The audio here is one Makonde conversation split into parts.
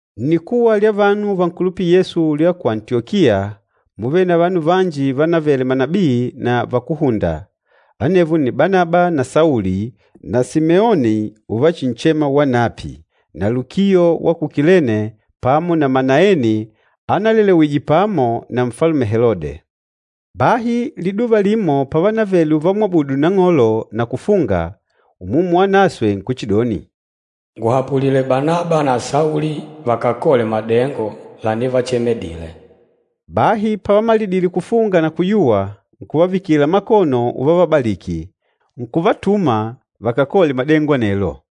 Nnikuwa lya vanu vankulupîla Yesu lya ku Antiyokiya múvele na vanu vanji vanavele manabii na vakúhunda, anevo nni Banaba na Sauli na Simeoni uvachinchema wanapi, na Lukio wa ku Kilene pamo na Manaeni analelewije pamo na Nfalume Helode. Bahi liduva limo pavanavele uvamwabudu Nang'olo na kufunga, Umumu Wanaswe nkuchidoni, “Nguhapulile Banaba na Sauli vakakole madengo lanivachemedile.” Bahi pavamalidile kufunga na kuyuwa, nkuvavikila makono uvavabaliki, nkuvatuma vakakole madengo anelo.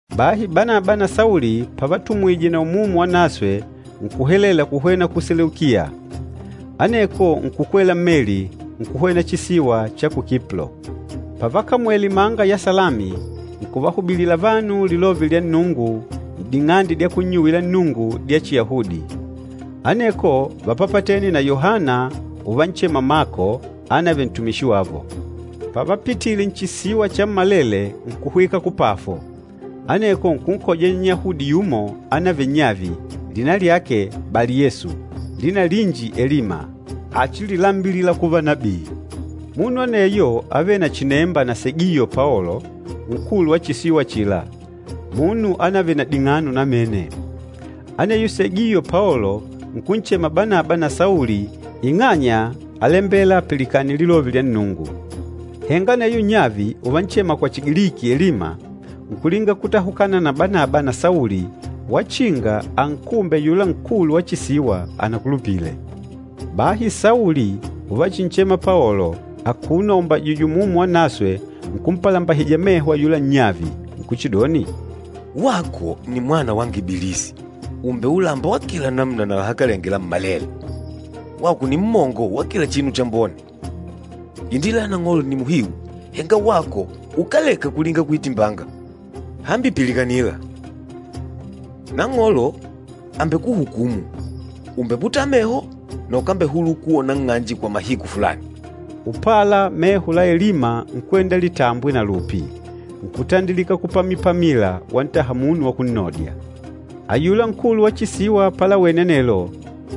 Bahi Banaba na Sauli pavatumwije na Umumu Wanaswe, nkuhelela kuhwena ku Seleukiya. Aneko nkukwela mmeli, nkuhwena chisiwa cha ku Kiplo. Pavakamwele imanga ya Salami, nkuvahubilila vanu Lilove lya Nnungu n'ding'ande dya kunnyuwila Nnungu dya Chiyahudi. Aneko vápapatene na Yohana uvanchema Mako anavele ntumishi wavo. Pavapitile nchisiwa chammalele nkuhwika ku Pafo, aneko nkunkoja Nnyahudi yumo anavele nnyavi, lina lyake Bali-Yesu, lina linji Elima, achililambilila kuva nabii. Munu aneyo ávele na chinemba na Segiyo Paolo, nkulu wa chisiwa achila, munu anavele na ding'ano namene. Aneyo Segiyo Paolo nkunchema Banaba na Sauli ing'anya álembela apilikane Lilove lya Nnungu. Henga aneyo nnyavi, uvanchema kwa Chigiliki, Elima, nkulinga kutahukana na Banaba na Sauli wachinga ankumbe ayula nkulu wa chisiwa anakulupile. Bahi Sauli uvachinchema Paolo, akuno aumbajìjwè Umumu Wanaswe nkumpalambahija meho ayula nnyavi. Nkuchidoni, “Wako nni mwana wanga Ibilisi, ùumbele ulamba wa kila namuna na lahakalenge lammalele! Wako nni mmongo wa kila chinu chambone! Indila ya Nang'olo nni muhiu, henga wako ukáleka kulinga kuitimbanga! Hambi pilikanila, Nang'olo àmbekuhukumu, ùmbeputala meho na ukambehulula kuwona nng'anje kwa mahiku fulani.” Upala meho la Elima nkwenda litambwe na lupi, nkutandilika kupamipamila wantaha munu wa kunnodya. Ayula nkulu wa chisiwa palawene anelo,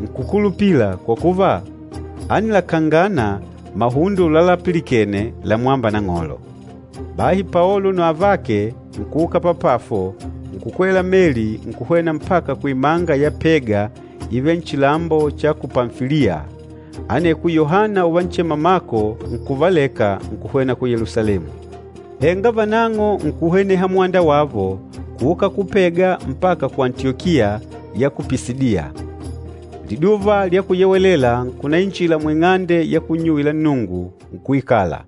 nkùkulupila kwa kuva, ánilakangana mahundo lalapilikene lamwâmba Nang'olo. Bahi Paolo na avake nkuuka pa Pafo nkukwela mmeli nkuhwena mpaka kuimanga ya Pega ivêle nchilambo cha ku Pamfiliya, aneko Yohana uvanchema Mako nkuvaleka nkuhwena ku Yelusalemu. Henga vanang'o nkuhweneha mwanda wavo kuuka ku Pega mpaka ku Antiyokiya ya ku Pisidiya. Liduva lya Kuyewelela nkunainjila muing'ande ya kunnyuwila Nnungu, nkuikala.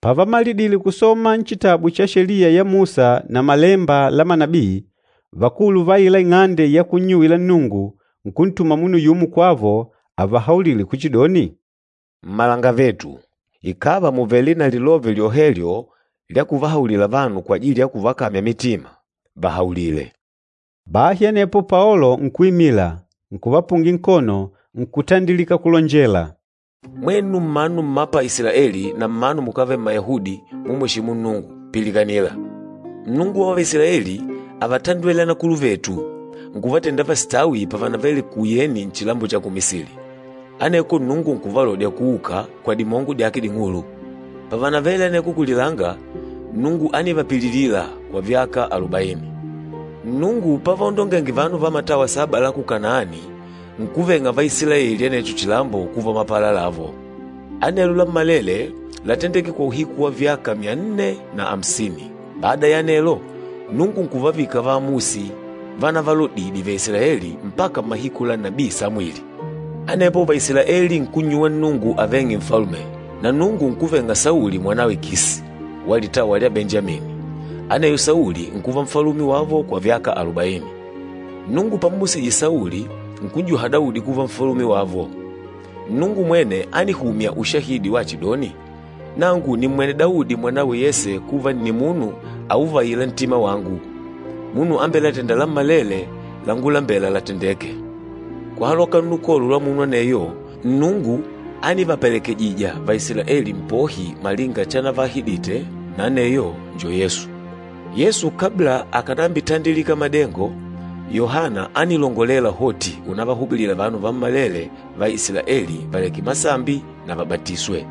Pavamalidile kusoma nchitabu cha Sheliya ya Musa na Malemba la manabii, vakulu va aila ing'ande ya kunnyuwila Nnungu nkuntuma munu yumo kwavo avahaulile kuchidoni, “Mmalangavetu, ikàva mùvele na lilove lyohelyo lya kuvahaulila vanu kwajili ya kuvakamya mitima, vahaulile.” Bahi anepo Paolo nkuimila, nkuvapungila nkono, nkutandilika kulonjela, “Mwenu mmanu mma pa Isilaeli na mmanu mukávele Mmayahudi, mumweshîmu Nnungu, pilikanila! Nnungu wa Vaisilaeli ávatandwele anakuluvetu, nkuvatenda vasitawi pavanavele kuyeni nchilambo cha ku Misili. Aneko Nnungu nkuvalodya kuuka, kwa dimongo dyake ding'ulu. Pavanavele aneko kulilanga, Nnungu ánivapililila kwa vyaka alubaini. Nnungu pavaondongenge vanu va matawa saba la ku Kanaani, nkuveng'a Vaisilaeli anecho chilambo kuva mapala lavo. Anelo lammalele látendeke kwa uhiku wa vyaka myanne na amsini. Bada ya anelo, Nnungu nkuvavika vaamusi vanavalodidye Vaisilaeli mpaka mmahiku la nabii Samwili. Anepo Vaisilaeli nkunnyuwa Nnungu aveng'e nfalume, na Nnungu nkuveng'a Sauli mwanawe Kisi, wa litawa lya Benjamini, aneyo Sauli nkuva nfalume wavo kwa vyaka alubaini. Nnungu pammusije Sauli, nkun'juha Daudi kuva nfalume wavo. Nnungu mwene ánihumya ushahidi wachidoni, ‘Nangu nìmmwene Daudi mwanawe Yese kuva nni munu auvaîla ntima wangu, munu ambelatênda lammalele langulambela latendeke.’ Kuhaloka nnukolo lwa munu aneyo, Nnungu ánivapelekejija Vaisilaeli Mpohi malinga chanavaahidite, na aneyo njo Yesu. Yesu kabla akànambitandilika madengo, Yohana ánilongolela hoti unavahubilila vanu vammalele va Isilaeli valeke masambi na vabatiswe.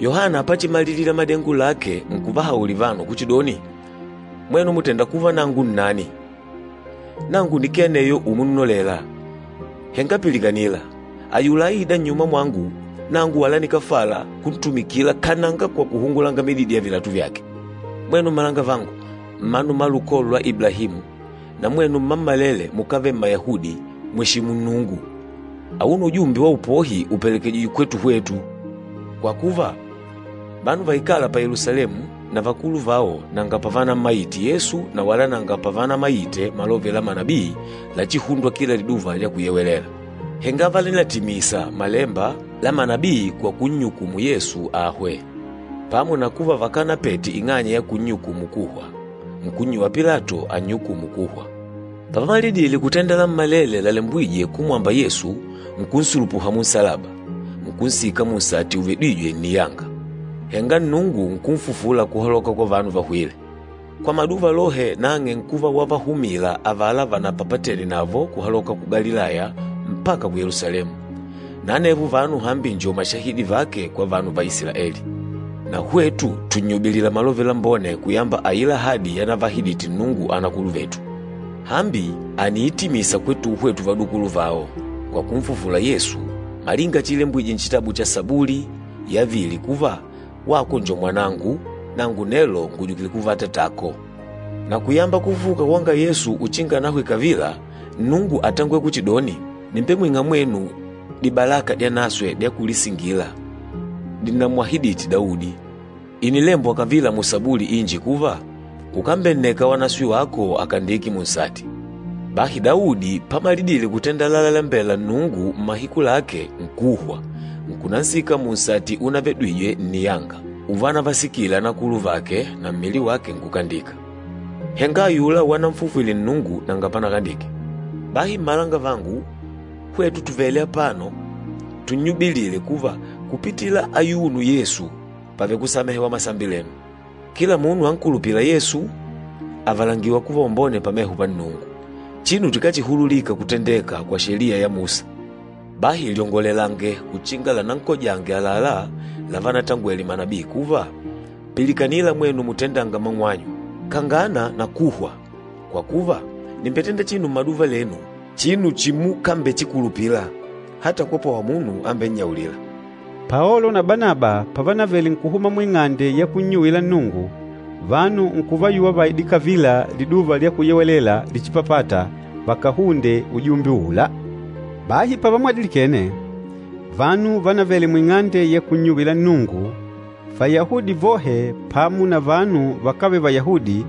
Yohana pachimalilila madengo lake nkuvahaulila vanu kuchidoni, ‘Mwenu mùtenda kuva nangu nnani? Nangu nikee aneyo umunnolela. Henga pilikanila, ayula aîda nnyuma mwangu, nangu wala nikáfala kuntumikila kananga kwa kuhungula mididi ya vilatu vyake.’ Mwenu mmalangavangu, mmanu mma lukolo lwa Iblahimu, na mwenu mmammalele mukávele Mmayahudi mumweshîmu Nnungu! Auno ujumbe wa upohi ùpelekejijwe kwetu hwetu. Kwa kuva, vanu vaikâla pa Yelusalemu na vakulu vao nanga pavanammaite Yesu na wala nanga pavanamaite malove la Manabii lachihundwa kila Liduva lya Kuyewelela. Henga vánilatimisa malemba la manabii kwa kunnyukumu Yesu ahwe. Pamo na kuva vakanapete ing'anya ya kunnyukumu kuhwa, nkunnyuwa Pilato annyukumu kuhwa. Pavamalidile kutenda lammalele lalembwîje kumwamba Yesu, nkunsulupuha munsalaba, nkunsika munsati uvedwîje nniyanga. Henga Nnungu nkunfufula kuhaloka kwa vanu vahwîle. Kwa maduva lohe nang'e nkuva wavahumila avala vanapapatene navo kuhaloka ku Galilaya mpaka ku Yelusalemu. Na anevo vanu hambi njo mashahidi vake kwa vanu va Isilaeli. Na hwetu tùnnyubilila Malove Lambone kuyamba aila ahadi yanavaahidite Nnungu anakuluvetu. Hambi àniitimisa kwetuhwe tuvadukuluvao, kwa kunfufula Yesu, malinga chiilembwije nchitabu cha Sabuli yavili kuva, ‘Wako njo Mwanangu, nangu nelo ngùjukile kuva Atatako.’ Na kuyamba kufufuka kwanga Yesu uchinga anahwe kavila, Nnungu átangwele kuchidoni, ‘Nìmbemwing'a mwenu dibalaka dyanaswe dya kulisingila, dinnamwahidite Daudi.’ Ìnilembwa kavila musabuli inji kuva, ‘Ukambenneka Wanaswe wako akandike munsati.’ Bahi Daudi pamalidile kutenda lalalembela Nnungu mmahiku lake, nkuhwa, nkunansika munsati unavedwije nniyanga, uvanavasikile anakuluvake na mmili wake nkukandika. Henga ayula wananfufwile Nnungu, nanga panakandike. Bahi mmalangavangu, hwetu tùvele apano tunnyubilile kuva kupitila ayuno Yesu pàvele kusamehewa masambi lenu. Kila munu ankulupîla Yesu àvalangiwa kuva wambone pameho pa Nnungu, chinu chikáchihululika kutendeka kwa Sheliya ya Musa. Bahi lyongolelange uchinga lanankojange àlalá lavanatangwele manabii kuva, ‘Pilikanila mwenu mutendânga mang'wanyu. Kangana na kuhwa, kwa kuva, nìmbetenda chinu mmaduva lenu, chinu chimukambechikulupila, ata kwapwawa munu ambennyaulîla.’” Paolo na Banaba pavanavele nkuhuma muing'ande ya kunnyuwila Nnungu, vanu nkuvayuwa vaide kavila Liduva lya Kuyewelela lichipapâta vakahunde ujumbe uula. Bahi pavamwadilikene, vanu vanavele muing'ande ya kunnyuwila Nnungu Vayahudi vohe pamo na vanu vakávele Vayahudi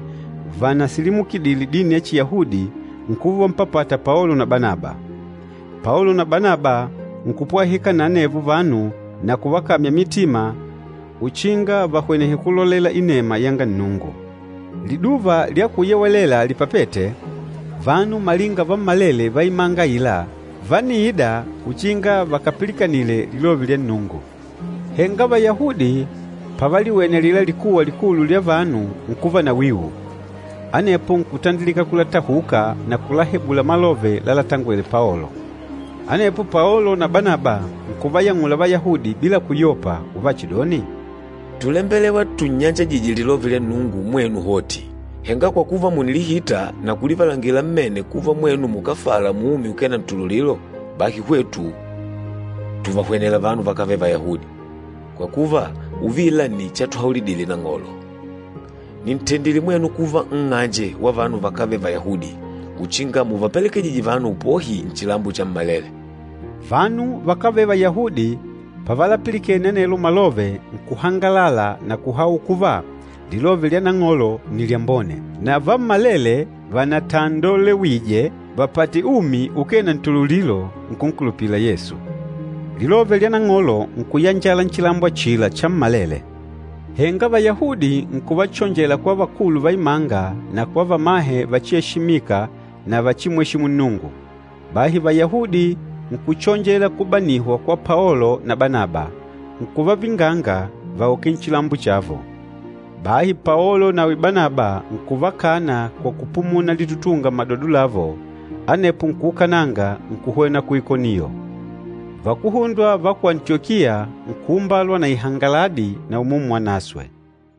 vanasilimukidile dini ya Chiyahudi nkuva uvampapata Paolo na Banaba. Paolo na Banaba nkupwahika na anevo vanu na kuvakamya mitima uchinga vahwenehe kulolela inema yanga Nnungu. Liduva lya Kuyewelela lipapête, vanu malinga vammalele va imanga aila vániida uchinga vakapilikanile Lilove lya Nnungu. Henga Vayahudi pavaliwene alila likuwa likulu lya vanu nkuva na wiu, anepo nkutandilika kulatahuka na kulahebula malove lalatangwele Paolo. Anepo Paolo na Banaba nkuvayang'ula Vayahudi bila kuyopa, uvachidoni, “Túlembelewa tunnyanjajije Lilove lya Nnungu mwenu hoti. Henga kwa kuva mùnilihita na kulivalangila mmene kuva mwenu mukáfala muumi ukee na ntululilo, bahi hwetu tùvahwenela vanu vakávele Vayahudi. Kwa kuva uvila nni chatuhaulidile Nang'olo, ‘Nìntendile mwenu kuva nng'anje wa vanu vakávele Vayahudi, uchinga muvapelekejije vanu upohi nchilambo chammalele.’” Vanu vakávele Vayahudi pavalapilikene anelo malove nkuhangalala na kuhaula kuva Lilove lya Nang'olo nni lyambone. Na vammalele vanatandolewije vapate umi ukee na ntululilo, nkunkulupila Yesu. Lilove lya Nang'olo nkuyanjala nchilambo achila chammalele. Henga Vayahudi nkuvachonjela kwa vakulu va imanga na kwa vamahe vachieshimika na vachimweshimu Nnungu. Bahi Vayahudi nkuchonjela kubanihwa kwa Paolo na Banaba, nkuvavinganga vauke nchilambo chavo. Bahi Paolo nawi Banaba nkuvakana kwa kupumuna litutunga mmadodo lavo, anepo nkuukananga nkuhwena ku Ikoniyo. Vakuhundwa va ku Antiyokia nkuumbalwa na ihangaladi na Umumu Wanaswe.